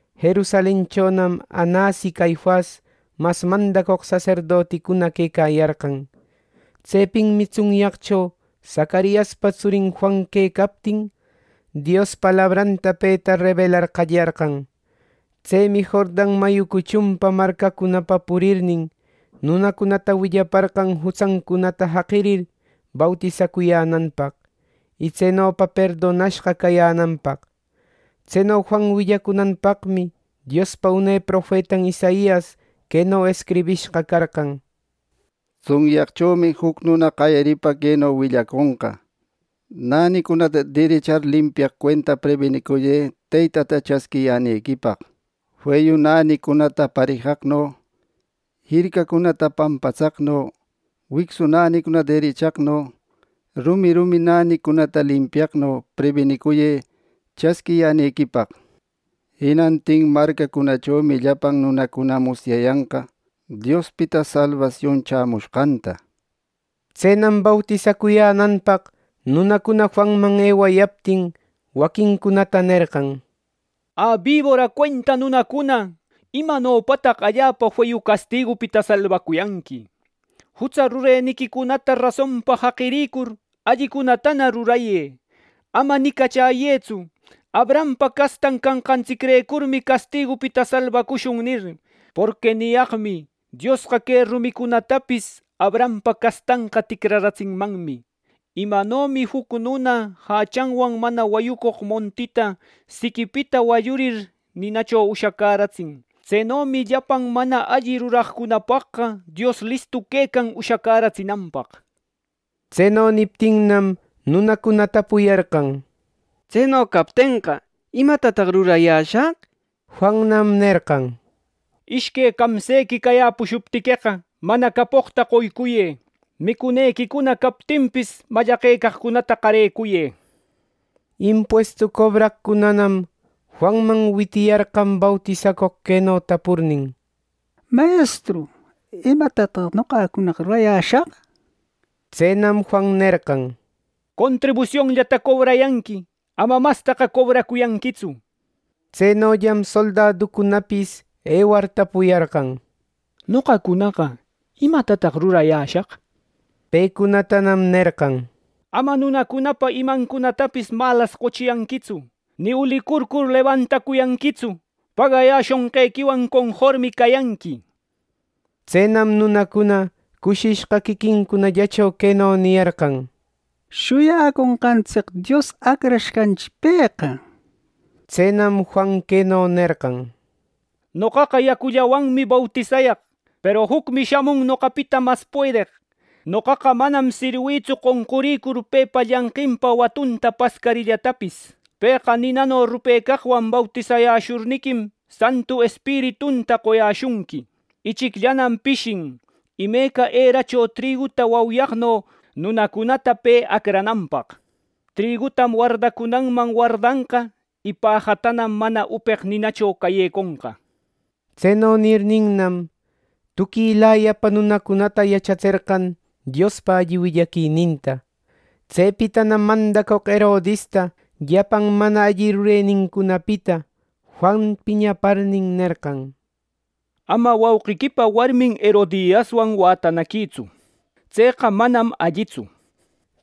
Jerusalenchonam Anas y Caifas mas mandacoq saserdoticuna quecayarqan. Tsepinmi tsunyaqcho Zacariaspa tsurin Juan quecaptin Dios palabranta peta rebelar qallarqan. Tsemi Jordan mayu cuchun marcacunapa purirnin, nunacunata willaparqan jutsancunata jaqirir, bautisacuyänanpaq, y tsenopa perdonashqa cayänanpaq. Tseno Juan willacunanpaqmi Diospa une profetan Isaias queno escribishqa carqan: “Tsunyaqchomi juc nuna qayaripa queno willaconqa: ‘Nänicunata derechar limpiaq cuenta prebinicuyë Teytata chasquiyänequipaq, feyu nänicunata parejaqno, jircacunata pampatsaqno, wicsu nänicunata derechaqno, rumi rumi nänicunata limpiaqno, prebinicuyë chasquiyänequipaq. Jinantin marcacunachomi llapan nunacuna musyayanqa, Diospita salbasion chämushqanta.’” Tsenam bautisacuyänanpaq nunacuna Juanman ewayaptin, waquincunata nerqan: —Ä, bibora cuenta nunacuna, ¿imanopataq allapa feyu castigupita salbacuyanqui! Jutsa rureniquicunata rasonpa jaqirïcur, allicunatana rurayë. Ama nicachäyëtsu: ‘Abrahampa castan canqantsicrecurmi castigupita salbacushun’ nir. Porqui niyaqmi: Diosqa que rumicunatapis Abrahampa castanqa ticraratsinmanmi. Imanomi juc nuna jachanwan mana wayücoq montita siquipita wallurir, ninacho ushacäratsin, tsenomi llapan mana alli ruraqcunapaqqa Dios listu quecan ushacäratsinanpaq. Tseno niptinnam, nunacuna tapuyarqan: —Tseno captenqa, ¿imatataq rurayäshaq? —nir. Juannam nerqan: —Ishque camsequi cayäpushuptiqueqa, mana capoqta qoycuyë. Micunequicuna captinpis, mallaqecaqcunata qarecuyë. Impuestu cobraqcunanam Juanman witiyarqan bautisacoq, queno tapurnin: —Mayestru, ¿imatataq noqacunaqa rurayäshaq? Tsenam Juan nerqan: —Contribusionllata cobrayanqui. Ama mastaqa cobracuyanquitsu. Tsenollam soldaducunapis ewar, tapuyarqan: —Noqacunaqa, ¿imatataq rurayäshaq? Pecunatanam nerqan: —Ama nunacunapa imancunatapis malas qochiyanquitsu, ni ulicurcur lebantacuyanquitsu. Pagayäshushqequiwan conformi cayanqui. Tsenam nunacuna cushishqa quiquincunallacho queno niyarqan: —Shuyaconqantsic Dios Acrashqanchi pëqa —nir. Tsenam, Juan queno nerqan: —Noqaqa yacullawanmi bautisayaq; peru jucmi shamun noqapita mas puedeq. Noqaqa manam sirwïtsu qonqurïcur pepa llanqinpa watunta pascarillatapis. Pëqa ninano rupecaqwan bautisayäshurniquim, Santu Espiritunta qoyäshunqui. Ichicllanam pishin, imeca eracho triguta wauyaqno nunacunata pe acrananpaq. Trigutam wardacunanman wardanqa y pajatanam mana upeq ninacho cayeconqa. Tseno nirninnam, tuquilayapa nunacunata yachatserqan Diospa alli willaquininta. Tsepitanam mandacoq Herodista llapan mana alli rurenincunapita Juan piñaparnin nerqan: —Ama wauqiquipa warmin Herodiaswan wätanaquïtsu. ¡Tseqa manam allitsu! —nir.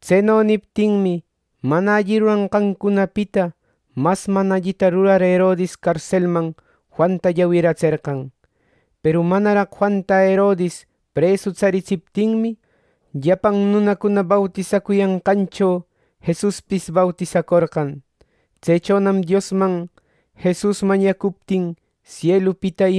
Tseno niptinmi, mana alli ruranqancunapita mas mana allita rurar Herodis carselman Juanta llawiratserqan. ˻Peru manaraq Juanta Herodis presu tsaritsiptinmi,˼ llapan nunacuna bautisacuyanqancho Jesuspis bautisacorqan. Tsechonam Diosman Jesus mañacuptin, sielupita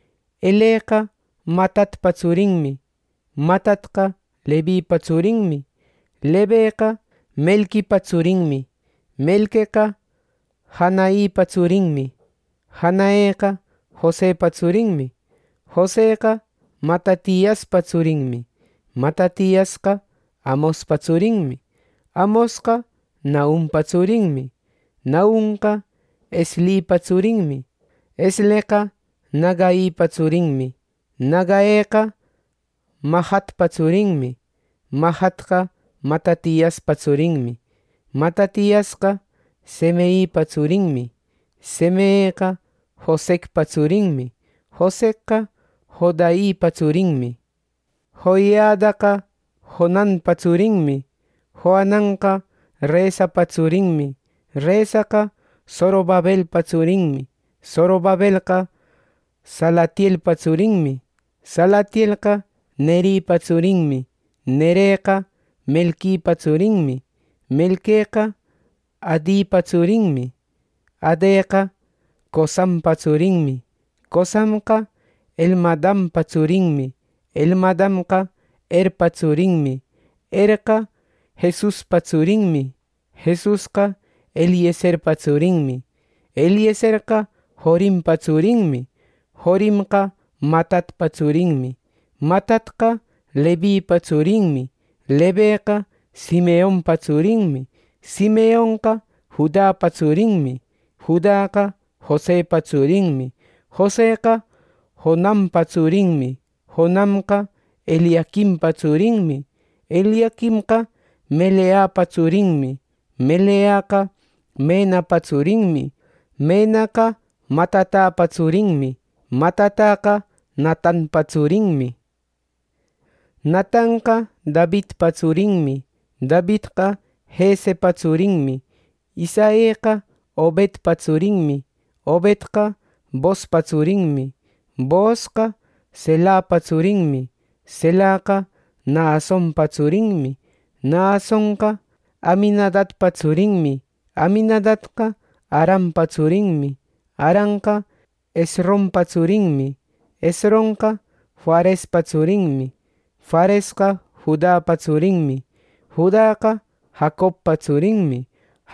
Eleqa Matatpa tsurinmi. Matatqa Levipa tsurinmi. Leveqa Melquipa tsurinmi. Melqueqa Janaipa tsurinmi. Janaeqa Josepa tsurinmi. Joseqa Matatiaspa tsurinmi. Matatiasqa Amospa tsurinmi. Amosqa Nahumpa tsurinmi. Nahumqa Eslipa tsurinmi. Esleqa Nagaipa tsurinmi. Nagaeqa Mahatpa tsurinmi. Mahatqa Matatiaspa tsurinmi. Matatiasqa Semeipa tsurinmi. Semeeqa Josecpa tsurinmi. Josecqa Joiadapa tsurinmi. Joiadaqa Joananpa tsurinmi. Joananqa Resapa tsurinmi. Resaqa Zorobabelpa tsurinmi. Zorobabelqa Salatielpa tsurinmi. Salatielqa Neripa tsurinmi. Nereqa Melquipa tsurinmi. Melqueqa Adipa tsurinmi. Adeqa Cosampa tsurinmi. Cosamqa Elmadampa tsurinmi. Elmadamqa Erpa tsurinmi. Erqa Jesuspa tsurinmi. Jesusqa Eliezerpa tsurinmi. Eliezerqa Jorimpa tsurinmi. Jorimqa Matatpa tsurinmi. Matatqa Levipa tsurinmi. Leveqa Simeonpa tsurinmi. Simeonqa Judapa tsurinmi. Judaqa Josepa tsurinmi. Joseqa Jonampa tsurinmi. Jonamqa Eliaquimpa tsurinmi. Eliaquimqa Meleapa tsurinmi. Meleaqa Menapa tsurinmi. Menaqa Matatapa tsurinmi. Matataqa Natanpa tsurinmi. Natanqa Davidpa tsurinmi. Davidqa Jesepa tsurinmi. Isaeqa Obedpa tsurinmi. Obedqa Boozpa tsurinmi. Boozqa Selahpa tsurinmi. Selahqa Nahasonpa tsurinmi. Nahasonqa Aminadabpa tsurinmi. Aminadabqa Arampa tsurinmi. Aramqa Hesronpa tsurinmi. Hesronqa Farespa tsurinmi. Faresqa Judapa tsurinmi. Judaqa Jacobpa tsurinmi.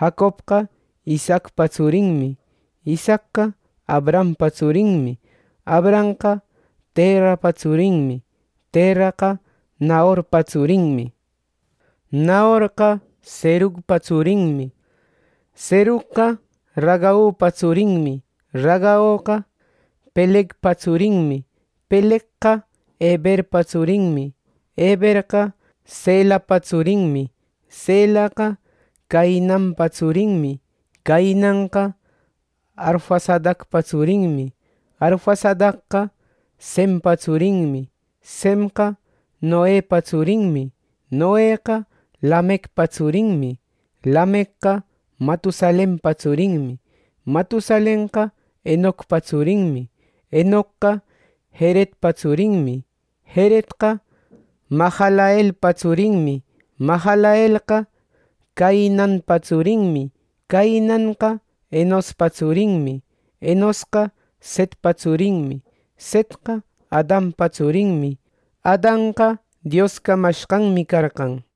Jacobqa Isaacpa tsurinmi. Isaacqa Abrahampa tsurinmi. Abrahamqa Terahpa tsurinmi. Terahqa Nahorpa tsurinmi. Nahorqa Serugpa tsurinmi. Serugqa Ragaupa tsurinmi. Ragaoqa Pelegpa tsurinmi. Pelegqa Eberpa tsurinmi. Eberqa Selahpa tsurinmi. Selahqa Cainanpa tsurinmi. Cainanqa Arfaxadpa tsurinmi. Arfaxadqa Sempa tsurinmi. Semqa Noepa tsurinmi. Noeqa Lamecpa tsurinmi. Lamecqa Matusalenpa tsurinmi. Matusalenqa Henocpa tsurinmi. Henocqa Jeredpa tsurinmi. Jeredqa Mahalaleelpa tsurinmi. Mahalaleelqa Cainanpa tsurinmi. Cainanqa Enospa tsurinmi. Enosqa Setpa tsurinmi. Setqa Adanpa tsurinmi. Adanqa Dios camashqanmi carqan.